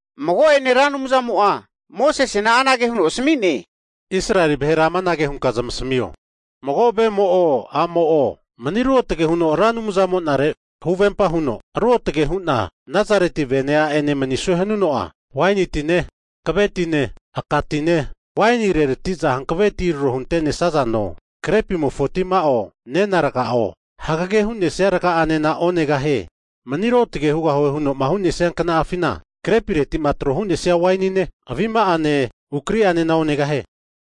Mago'ene Ra Anumzamo'a Mosesena anage huno asami'ne, Israeli vahera amanage hunka zamasmio, mago vemo'o, a'mo'o mani ruotge huno Ra Anumzamo'nare huvempa huno ruotge hu'na Nazareti vene a'ene manisue hanuno'a, waini tine, hankave tine aka tine, waini reratiza hankave ti tro hunte'nesazo, grepimofo tima'o, nena raga'o, hagege hune'sia raga'anena onegahie. Mani ruotge hugahue huno'ma hu'nesia kna'afina, krepiretima tro hu'nesia wainine, avima'ane ukri'anena onegahie.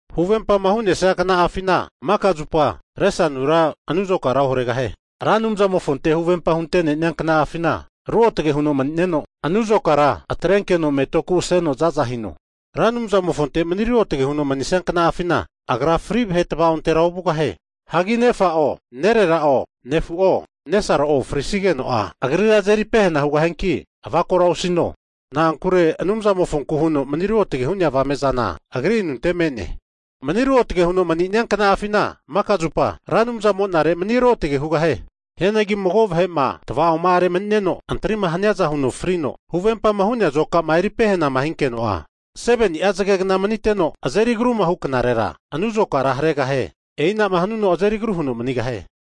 Huvempama hu'nesia kna'afina maka zupa resanura anu azokara oharegahie. Ra Anumzamofonte huvempa hunte'nenia kna'afina ruotge huno mani'neno, anu azokara atrenkeno metoku aseno zaza hino. Ra Anumzamofonte mani ruotge huno mani'nesia kna'afina, agra fri vahe tvaontera ovugahie. Hagi nefa'o, nerera'o, nefu'o, nesaro'o frisigeno'a agrira azeri pehena hugahianki avakora osino. Na'ankure Anumzamofonku huno mani ruotge hu'nea avame'zana agri anunte me'ne. Mani ruotge huno mani'nia kna'afina maka'a zupa, Ra Anumzamo'nare mani ruotge hugahie. Hianagi mago vahe'ma tvaoma'are mani'neno antrima haniaza huno frino, huvempama hu'nea azokama eri pehanama hinkeno'a, 7ni'a zagegna maniteno azeri agruma huknarera anu azokara haregahie. E'inama hanuno azeri agru huno manigahie.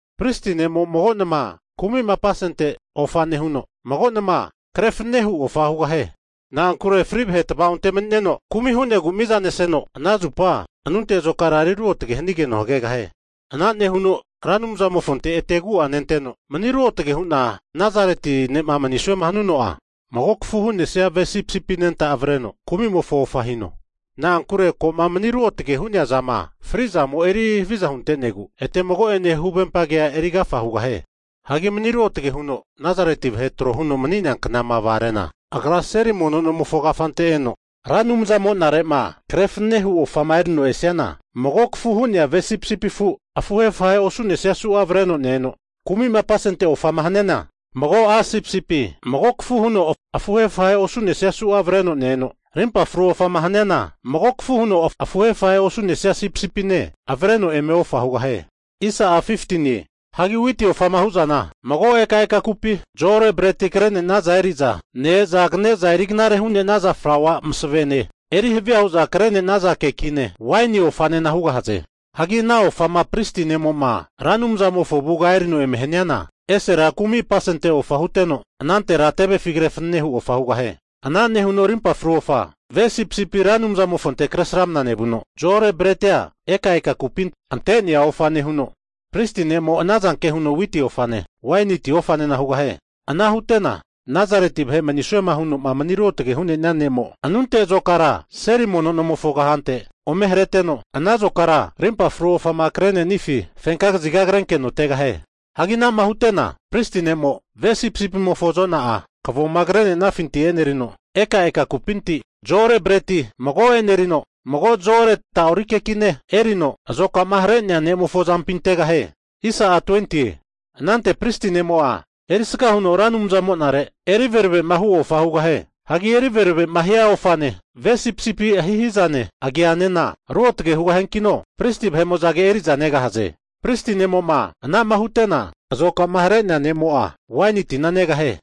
Pristi ne'mo'a mago nama kumi'ma apasente ofa nehuno, mago nama kre fanene hu ofa hugahie. Na'ankure fri vahe tva'onte mani'neno kumi' hu'negu mizaneseno, ana zupa anunte azokara eri ruotge hanigeno hagegahie. Ana nehuno Ra Anumzamofonte ete agu'a nenteno, mani ruotge huno Nazareti ne'ma manisuema hanuno'a, mago kafu hu'nesia ve sipisipi anenta avreno kumi'mofo ofa hino. Na'ankure ko'ma mani ruotge hu'nea zama fri'zamo eri haviza hunte'negu, eteno mago'ene huvempa kea eri agafa hugahie. Hagi mani ruotge huno Nazareti vahe tro huno mani'nea kna'ama vagare'na, agra seli mono nomofo kafante eno, Ra Anumzamo'nare kre fanenema hu ofama eri'noma esiana, mago kafu hu'nesia ve sipisipi afuhe afuhe osu'nesia su'a avreno ne-eno, kumi'ma apasente ofama haniana, mago a' sipisipi mago kafu huno afuhe afahe osu'nesia avreno ne-eno, rimpa fru ofama haniana, mago kafu huno afuhe afahe osu'nesia sipisipine avre'no eme ofa hugahie. Hagi witi ofama hu'zana, mago eka eka kupi, zo-ore breti krenenaza eri'za ne-eza kaneza eri knare hu'naza flaua masavene eri havia huza kre'naza kekine, waini ofanena hugahaze. Hagi ana ofama pristi ne'mo'ma Ra Anumzamofo avuga erino eme haniana, esera kumi' apasente ofa huteno, anantera tevefi kre fanene hu ofa hugahie. Ana nehuno rimpa fru ofa ve sipisipi Ra Anumzamofonte kresramna nevuno, zo-ore bretia eka eka kupi ante'nea ofa nehuno, pristi ne'mo'a anazanke huno witi ofane, waini ti ofanena hugahie. Ana hutena Nazareti vahe manisuema huno'ma mani ruotagema hu'nea ne'mo anuntetira azokara seli mono nomofo kahante ome hareteno, ana azokara rimpa fru ofama kre'nenifi fenka kaziga krenkeno tegahie. Hagi ana'ma hute'na pristi ne'mo'a ve sipisipimofo azona'a kavoma krenenafinti e'nerino, ekaeka kupinti zo-ore bretia mago e'nerino, mago zo-ore ta'ori kekine erino, azokama hare'nea ne'mofo azampi antegahie. Anante pristi ne'mo'a erisga huno Ra Anumzamonare eri veravema hu ofa hugahie. Hagi eri veravema hia ofane ve sipisipi ahihizane agianena ruotge hugahiankino pristi vahe'mo'zage eri'za negahaze. Pristi ne'mo'ma ana'ma hutena azokama hare'nea ne'mo'a waini tina negahie.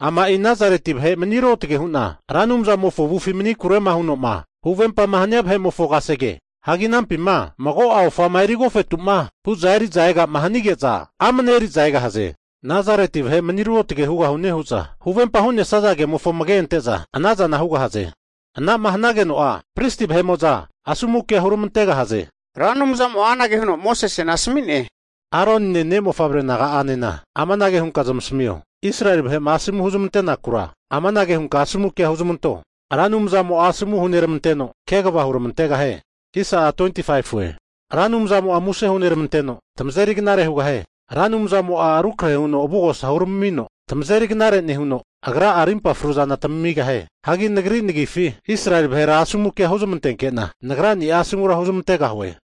Ama'i Nazareti vahe mani ruotge hu'na Ra Anumzamofo avufi manikurema huno'ma huvempama hania vahe'mofo kasege. Hagi anampima mago'a ofama eri agofetuma huza eriza ega'ma hanige'za amne eri'za egahaze. Nazareti vahe mani ruotge hugahune hu'za huvempama hu'nesaza kemofo amage ante'za anazana hugahaze. Ana'ma hanageno'a, Pristi vahe'mo'za asomu kea huramantegahaze. Ra Anumzamo'a anage huno Mosesena asami'ne, Aronine, ne'mofavre naga'anena amanage hunka zamasmio, Israeli vahe'ma asomu kema huzmantekura, amanage hunka asomu kea huzmanto. Ra Anumzamo'a asomu huneramanteno, kegava huramantegahie. Ra Anumzamo muse huneramanteno, tamazeri knare hugahie. Ra Anumzamo'a rukrahe huno avugosa huramino tamazeri knare nehuno, Agra'a rimpa fruzana tamigahie. Hagi Nagri nagifi Israeli vahera asomu kea hu'zmantenkena, Nagra'nia asomura huzmantegahue.